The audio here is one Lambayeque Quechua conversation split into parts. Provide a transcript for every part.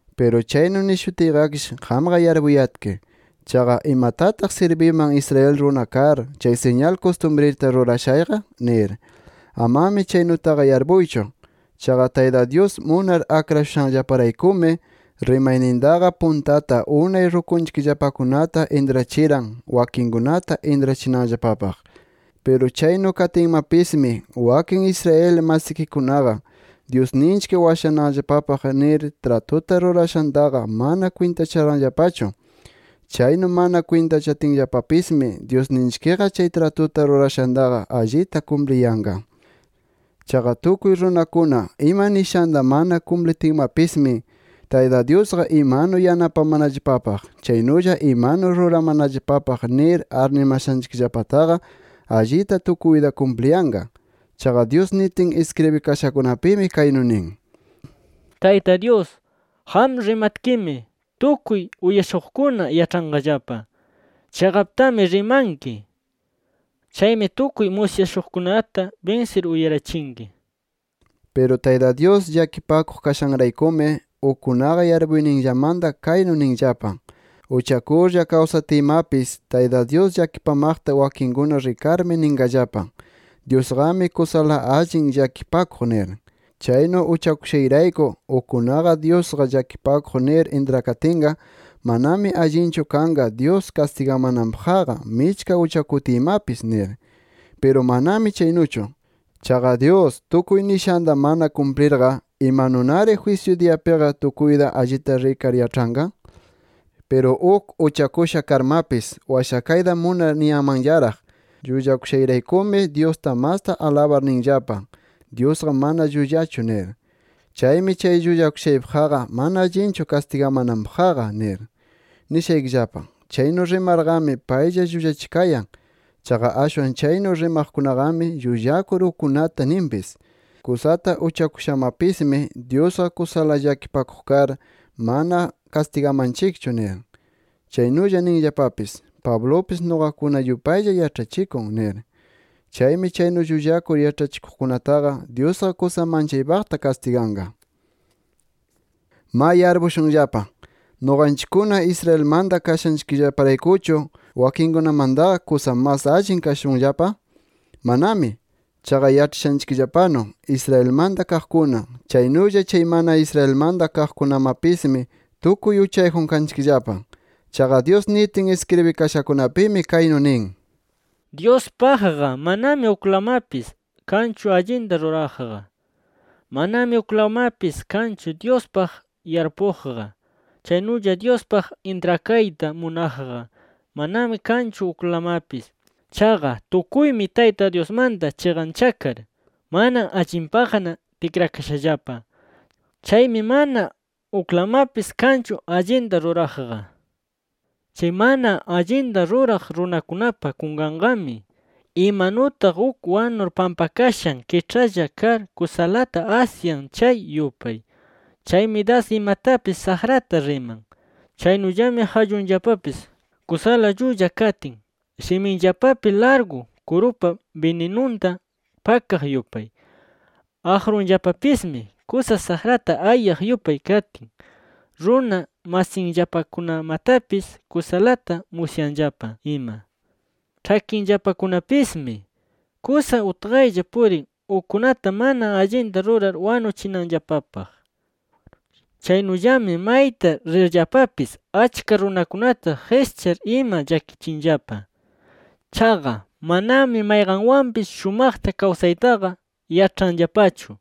Piru chaynu nishutiyqakish qamqa yarpuyatki, chaqa ¿imatataq sirbiman Israel runa kar, chay siñal kustumrita rurashayqa? nir. Amami chaynutaqa yarpuychu. Chaqa Tayta Dyus munar akrashushanllaparaykumi, rimaynintaqa puntata unay rukuykillapakunata intrachiran, wakinkunata intrachinanllapapaq. Piru chaynu katinmapismi, wakin Israel masikikunaqa Dyusninchik washananllapapaq nir tratuta rurashantaqa mana kwintacharanllapachu. Chaynu mana kwintachatinllapamapismi, Dyusninchikqa chay tratuta rurashantaqa allita kumpliyanqa. ¡Chaqa tukuy runakuna ima nishanta mana kumplitinmapismi, Tayta Dyusqa imanu yanapamanallapapaq, chaynulla imanu ruramanallapapaq nir arnimashanchikllapataqa, allita tukuyta kumpliyanqa! Chaqa Dyus nitin iskribikashakunapimi kaynu nin: ¡Tayta Dyus, qam rimatkimi tukuy uyashuqkuna yaĉhanqallapa, chiqaptami rimanki! ¡Chaymi tukuy musyashuqkunata binsir, uyarachinki! nir. Piru Tayta Dyus llakipakuq kashanraykumi, ukkunaqa yarpuyninllamanta kaynu ninllapa: Uchakurlla kawsatiymapis Tayta Dyus llakipamaqta wakinkuna rikarmi, ninllapa: Dyusqami kusala allin llakipakuq nir. Chaynu uchakushayrayku ukkunaqa Dyusqa llakipakuq nir intrakatinqa, manami allinchu kanqa Dyus kastigamananpaqqa michka uchakutiymapis nir. ¡Piru manami chaynuchu! Chaqa Dyus tukuy nishanta mana kumplirqa, ¿imanunari jwisyu diyapiqa tukuyta allita rikar yaĉhanqa? Piru uk uchakusha karmapis, washakayta munar niyanmanllaraq: “Llullakushayraykumi Dyusta masta alabar ninllapa: ‘Dyusqa mana llullachu’ nir. Chaymi chay llullakushaypaqqa, mana allinchu kastigamananpaqqa” nir. Nishaykillapa: Chaynu rimarqami, paylla llullachikayan. Chaqa ashwan chaynu rimaqkunaqami, llullakur ukkunata ninpis: “Kusata uchakushamapismi, Dyusqa kusala llakipakuq kar, mana kastigamanchikchu” nir. Chaynulla ninllapapis: “Pablupis nuqakuna yupaylla yaĉhachikun” nir. Chaymi chaynu llullakur yaĉhachikuqkunataqa, Dyusqa kusa manchaypaqta kastiganqa. ¡Ma yarpushunllapa! ¿Nuqanchikkuna Israelmanta kashanchikllaparaykuchu, wakinkunamantaqa kusa mas allin kashunllapa? ¡Manami! Chaqa yaĉhachishushayllapanu Israelmanta kaqkuna, chaynulla chay mana Israelmanta kaqkunamapismi tukuy uchayjun kanchikllapa. Chaqa Dyus nitin iskribikashakunapimi kaynu nin: “Dyuspaqqa manami uklamapis kanchu allinta ruraqqa. Manami uklamapis kanchu Dyuspaq yarpuqqa. Chaynulla Dyuspaq intrakayta munaqqa manami kanchu uklamapis. Chaqa tukuymi Tayta Dyusmanta chiqanchakar, mana allinpaqna tikrakashallapa. Chaymi mana uklamapis kanchu allinta ruraqqa. Chay mana allinta ruraq runakunapa kunkanqami, imanutaq uk wanur pampakashan kiĉhalla kar kusalata asyan, chay yupay. Chaymi das imatapis saqrata riman. Chaynullami qallunllapapis kusala llulla katin, shiminllapapi largu kurupa bininunta pakaq yupay. Aqrunllapapismi kusa saqrata ayaq yupay katin, runa masinllapakunamatapis kusalata musyanllapa ima. Ĉhakinllapakunapismi kusa utqaylla purin ukkunata mana allinta rurar wanuchinanllapapaq. Chaynullami mayta rirllapapis achka runakunata qischar ima llakichinllapa. Chaqa manami mayqanwanpis shumaqta kawsaytaqa yaĉhanllapachu.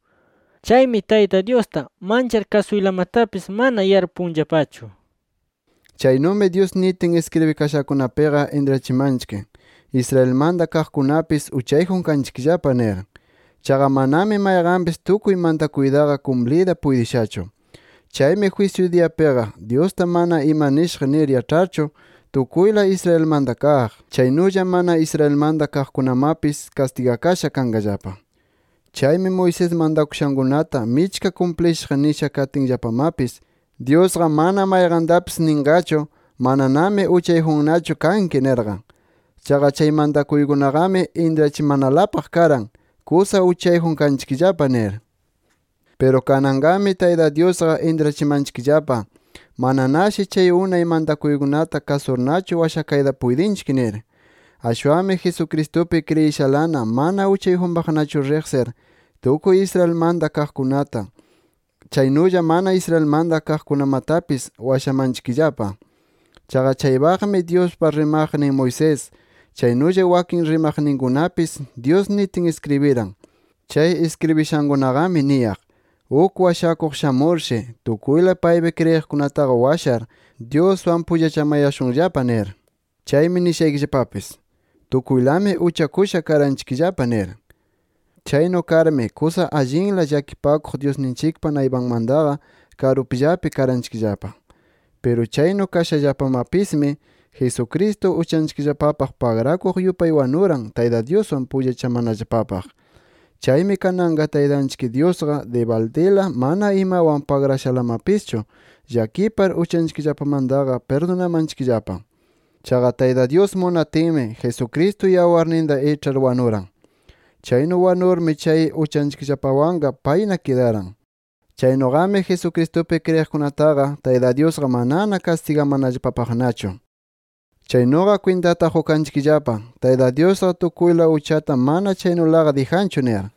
Chaymi Tayta Dyusta manchar kasuylamatapis mana yarpunllapachu” nir. Chaynumi Dyus nitin iskribikashakunapiqa intrachimanchik Israelmanta kaqkunapis uchayjun kanchikllapa nir. Chaqa manami mayqanpis tukuy mantakuytaqa kumpliyta puytishachu. Chaymi jwisyu diyapiqa, Dyusta mana ima nishaq nir yaĉharchu tukuyla Israelmanta kaq, chaynulla mana Israelmanta kaqkunamapis kastigakasha kanqallapa. Chaymi Moisés mantakushankunata michka kumplishaq nisha katinllapamapis, Dyusqa mana mayqantapis ninqachu: “Mananami uchayjunnachu kanki” nirqa. Chaqa chay mantakuykunaqami intrachimanalapaq karan: “Kusa uchayjun kanchikllapa” nir. Piru kananqami Tayta Dyusqa intrachimanchikllapa, mananashi chay unay mantakuykunata kasurnachu washakayta puytinchik nir. Ashwanmi Jesucristupi kriyishalana mana uchayjunpaqnachu riqsir, tukuy Israelmanta kaqkunata chaynulla mana Israelmanta kaqkunamatapis washamanchikllapa. Chaqa chaypaqmi Dyuspa rimaqnin Moisés, chaynulla wakin rimaqninkunapis Dyus nitin iskribiran. Chay iskribishankunaqami niyaq: “Uk washakuq shamurshi, tukuyla paypi kriyiqkunataqa washar, Dyuswan pullachamayashunllapa” nir. Chaymi nishaykillapapis: Tukuylami uchakusha karanchikllapa nir. Chaynu karmi kusa allinla llakipakuq Dyusninchikpa naypanmantaqa karupllapi karanchikllapa. Piru chaynu kashallapamapismi, Jesucristo uchanchikllapapaq pagrakuq yupay wanuran Tayta Dyuswan pullachamanallapapaq. Chaymi kananqa Taytanchik Dyusqa dibaldila mana imawan pagrashalamapischu llakipar uchanchikllapamantaqa pirdunamanchikllapa. Chaqa Tayta Dyus munatinmi Jesucristo yawarninta iĉhar wanuran. Chaynu wanurmi chay uchanchikllapawanqa payna kidaran. Chaynuqami Jesucristupi kriyiqkunataqa Tayta Dyusqa manana kastigamanallapapaqnachu. Chaynuqa kwintata qukanchikllapa, Tayta Dyusqa tukuyla uchata mana chaynulaqa dijanchu nir.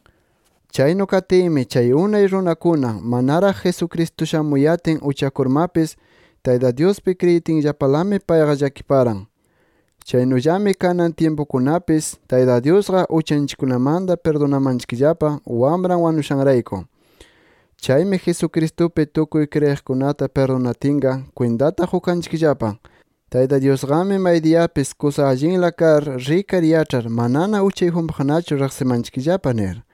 Chaynu katinmi chay unay runakuna, manaraq Jesucristo shamuyatin uchakurmapis Tayta Dyuspi kriyitinllapalami payqa llakiparan. Chaynullami kanan tyimpukunapis Tayta Dyusqa uchanchikkunamanta pirdunamanchikllapa, Wamran wanushanrayku. Chaymi Jesucristupi tukuy kriyiqkunata pirdunatinqa, kwintata qukanchikllapa: Tayta Dyusqami maydiyapis kusa allinla kar, rikar yaĉhar manana uchayjunpaqnachu riqsimanchikllapa nir.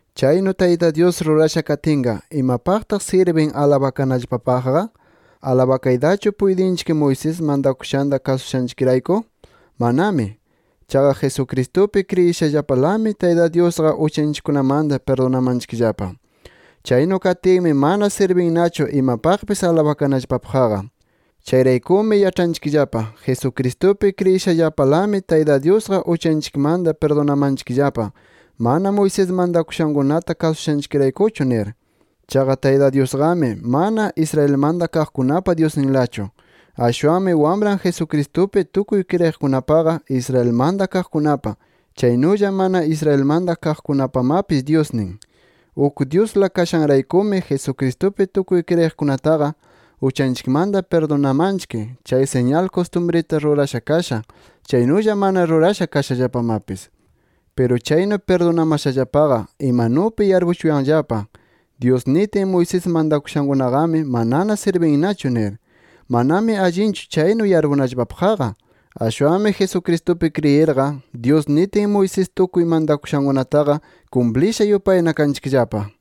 Chaynu Tayta Dyus rurasha katinqa, ¿imapaqtaq sirbin alabakanallapapaqqa? ¿Alabakaytachu puytinchik Moisés mantakushanta kasushanchikrayku? ¡Manami! Chaqa Jesucristupi kriyishallapalami, Tayta Dyusqa uchanchikkunamanta pirdunamanchikllapa. Chaynu katinmi mana sirbinnachu imapaqpis alabakanallapapaqqa. Chayraykumi yaĉhanchikllapa Jesucristupi kriyishallapalami Tayta Dyusqa uchanchikmanta pirdunamanchikllapa, mana Moisés mantakushankunata kasushanchikraykuchu nir. Chaqa Tayta Dyusqami mana, Israelmanta kaqkunapa Dyusninlachu. Ashwanmi Wamran Jesucristupi tukuy kriyiqkunapaqa, Israelmanta kaqkunapa, chaynulla mana Israelmanta kaqkunapamapis Dyusnin. Uk Dyusla kashanraykumi Jesucristupi tukuy kriyiqkunataqa uchanchikmanta pirdunamanchik, chay siñal kustumrita rurasha kasha, chaynulla mana rurasha kashallapamapis. Piru chaynu pirdunamashallapaqa, imanupi yarpuchuwanllapa Dyus nitin Moisés mantakushankunaqami manana sirbinnachu nir. ¡Manami allinchu chaynu yarpunallapapaqqa! Ashwanmi Jesucristupi kriyirqa, Dyus nitin Moisés tukuy mantakushankunataqa kumplisha yupayna kanchikllapa.